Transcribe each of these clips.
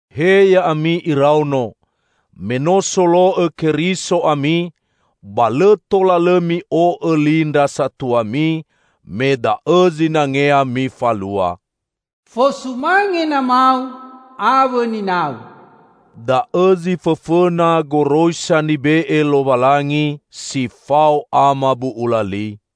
He ya'ami iraono! Me no solo'õ Keriso ami, ba lõ tola lõ mi'o'õ li ndra satuami, me da'õ zinangea mifalua. "Fosumange namau awõ ninau" da'õ zi fõfõna goroisa nibe'e Lowalangi si fao amabu'ula li: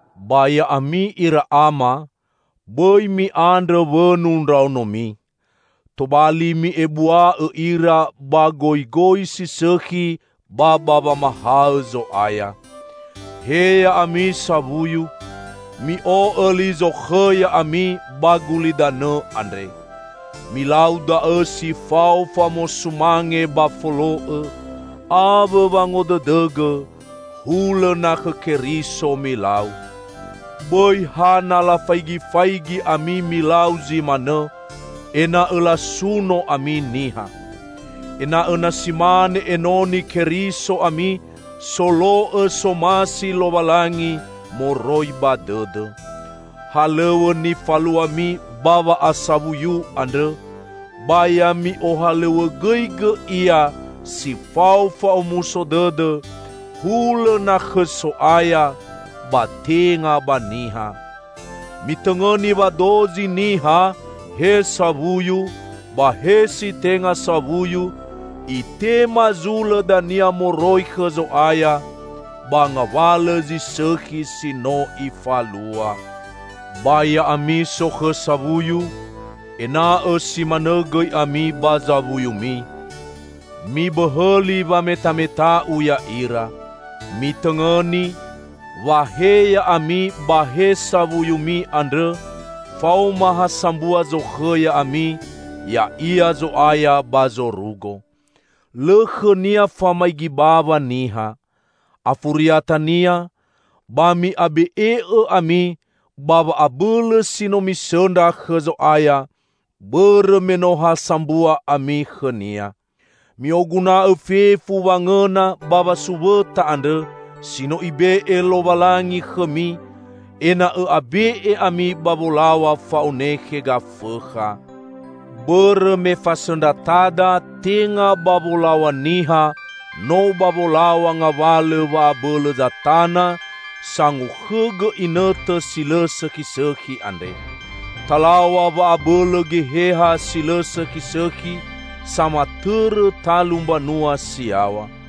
Ba ya'ami, ira ama! Bõi mi'andrõ wõnu ndraonomi. Tobali, mi'ebua'õ ira ba goigoi si sõkhi ba ba wamahaõ Zo'aya. He ya'ami sawuyu! Mi'o'õ li zokhõ ya'ami ba gulidanõ andre. Milau da'õ si fao famosumange ba folo'õ, awõ wangodõdõgõ, hulõ na khõ Keriso milau. Bõi ha na lafaigifaigi ami milau zi manõ, ena'õ lasuno ami niha. Ena'õ na si mane enoni Keriso ami, solo'õ somasi Lowalangi moroi ba dõdõ. Halõw̃õ nifaluami ba wa'a'sawuyu andrõ, ba ya mi'ohalõw̃õgõigõ ia si fao fa'omuso dõdõ, hulõ na khõ So'aya, ba tenga ba niha. Mitõngõni wa dozi niha, he sawuyu, ba he si tenga sawuyu, itema zulõ dania moroi khõ Zo'aya, ba ngawalõ zi sõkhi si no ifalua. Ba ya'ami sokhõ sawuyu! Ena'õ si manõ gõi ami ba zawuyumi. Mibõhõli wametameta'u ya'ira. Mitõngõni, wa he ya'ami ba he sawuyumi andrõ, faoma ha sambua zokhõ ya'ami, ya'ia Zo'aya ba zorugo. Lõ khõ-Nia famaigi bawa niha. Afuriatania, ba mi'abe'e'õ ami ba wa'abõlõ si no misõndra khõ Zo'aya, bõrõ me no ha sambua ami khõ-Nia. Mi'oguna'õ fefu wangõna ba wasuwõta andrõ, si no Ibe'e Lowalangi khõmi, ena'õ abe'e ami ba wolaw̃a fa'onekhe Gafõkha. Bõrõ me fasõndratada tenga ba wolaw̃a niha, no ba wolaw̃a ngawalõ wa'abõlõ zatana sangokhõgõ inõtõ si lõ sõkhisõkhi andre. Talaw̃a wa'abõlõ geheha si lõ sõkhisõkhi, samatõrõ talu mbanua si yaw̃a.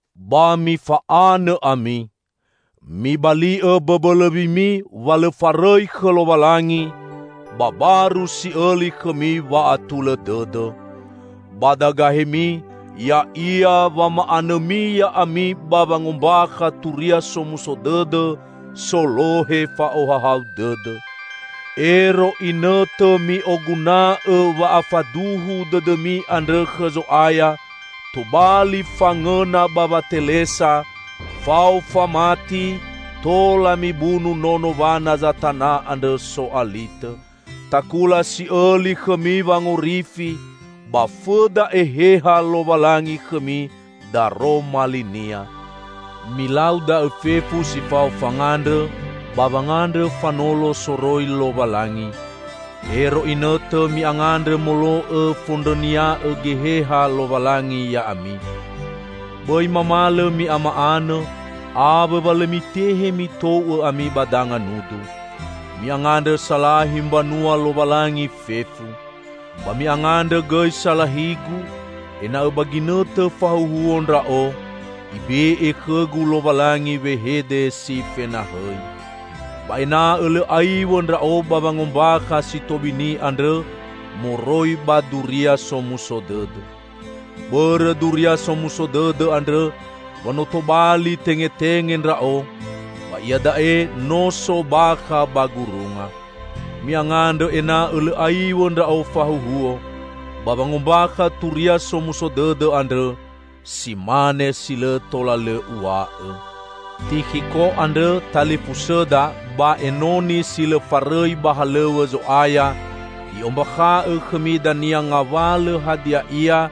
Ba mifa'anõ ami. Mibali'õ bõbõlõwimi wa lõ farõi khõ Lowalangi, ba baru si'õli khõmi wa'atulõ dõdõ. Badagahemi ya'ia wama'anõmi ya'ami ba wangombakha Turia Somuso Dõdõ, solohe fa'ohahau dõdõ. Ero inõtõ mi'oguna'õ wa'afaduhu dõdõmi andrõ khõ Zo'aya tobali fangõna ba watelesa; fao famati tola mibunu nono wana zatana andrõ so'alitõ. Takula si'õli khõmi wangorifi, ba fõda Eheha Lowalangi khõmi daroma li-Nia. Milau da'õ fefu si fao fangandrõ, ba wangandrõ fanolo soroi Lowalangi. Ero inõtõ mi'angandrõ molo'õ fondrõnia'õ Geheha Lowalangi ya'ami. Bõi mamalõ mi'amanõ, awõ wa lõ mitehe mitou'õ ami ba danga nudu. Mi'angandrõ salahi mbanua Lowalangi fefu. Ba mi'angandrõ gõi salahigu, ena'õ ba ginõtõ fahuhuo ndra'o, Ibe'e khõgu Lowalangi wehede si fenahõi. Ba ena'õ lõ aiw̃õ ndra'o ba wangombakha si tobini andrõ moroi ba Duria Somuso Dõdõ. Bõrõ Duria Somuso Dõdõ andrõ wa no tobali tengetenge ndra'o, ba iada'e no so bakha ba gurunga. Mi'angandrõ ena'õ lõ aiw̃õ ndra'o fahuhuo, ba wangombakha Turia Somuso Dõdõ andrõ, si mane si lõ tola lõ uw̃a'õ. Tikhiko andrõ, talifusõda ba enoni si lõ farõi ba halõw̃õ Zo'aya, i'ombakha'õ khõmi dania ngawalõ hadia ia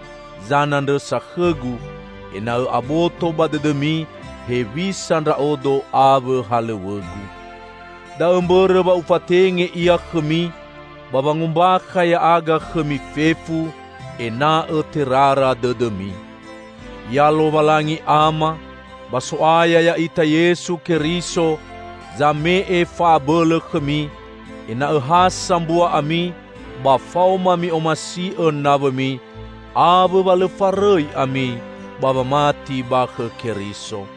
zanandrõsa khõgu, ena'õ aboto ba dõdõmi hewisa ndra'odo awõ halõw̃õgu. Da'õ mbõrõ wa ufatenge ia khõmi, ba wangombakha ya'aga khõmi fefu, ena'õ terara dõdõmi. Ya Lowalangi Ama, ba So'aya ya'ita, Yesu Keriso zame'e fa'abõlõ khõmi ena'õ ha sambua ami ba faoma mi'omasi'õ nawõmi, awõ wa lõ farõi ami ba wamati ba khõ Keriso.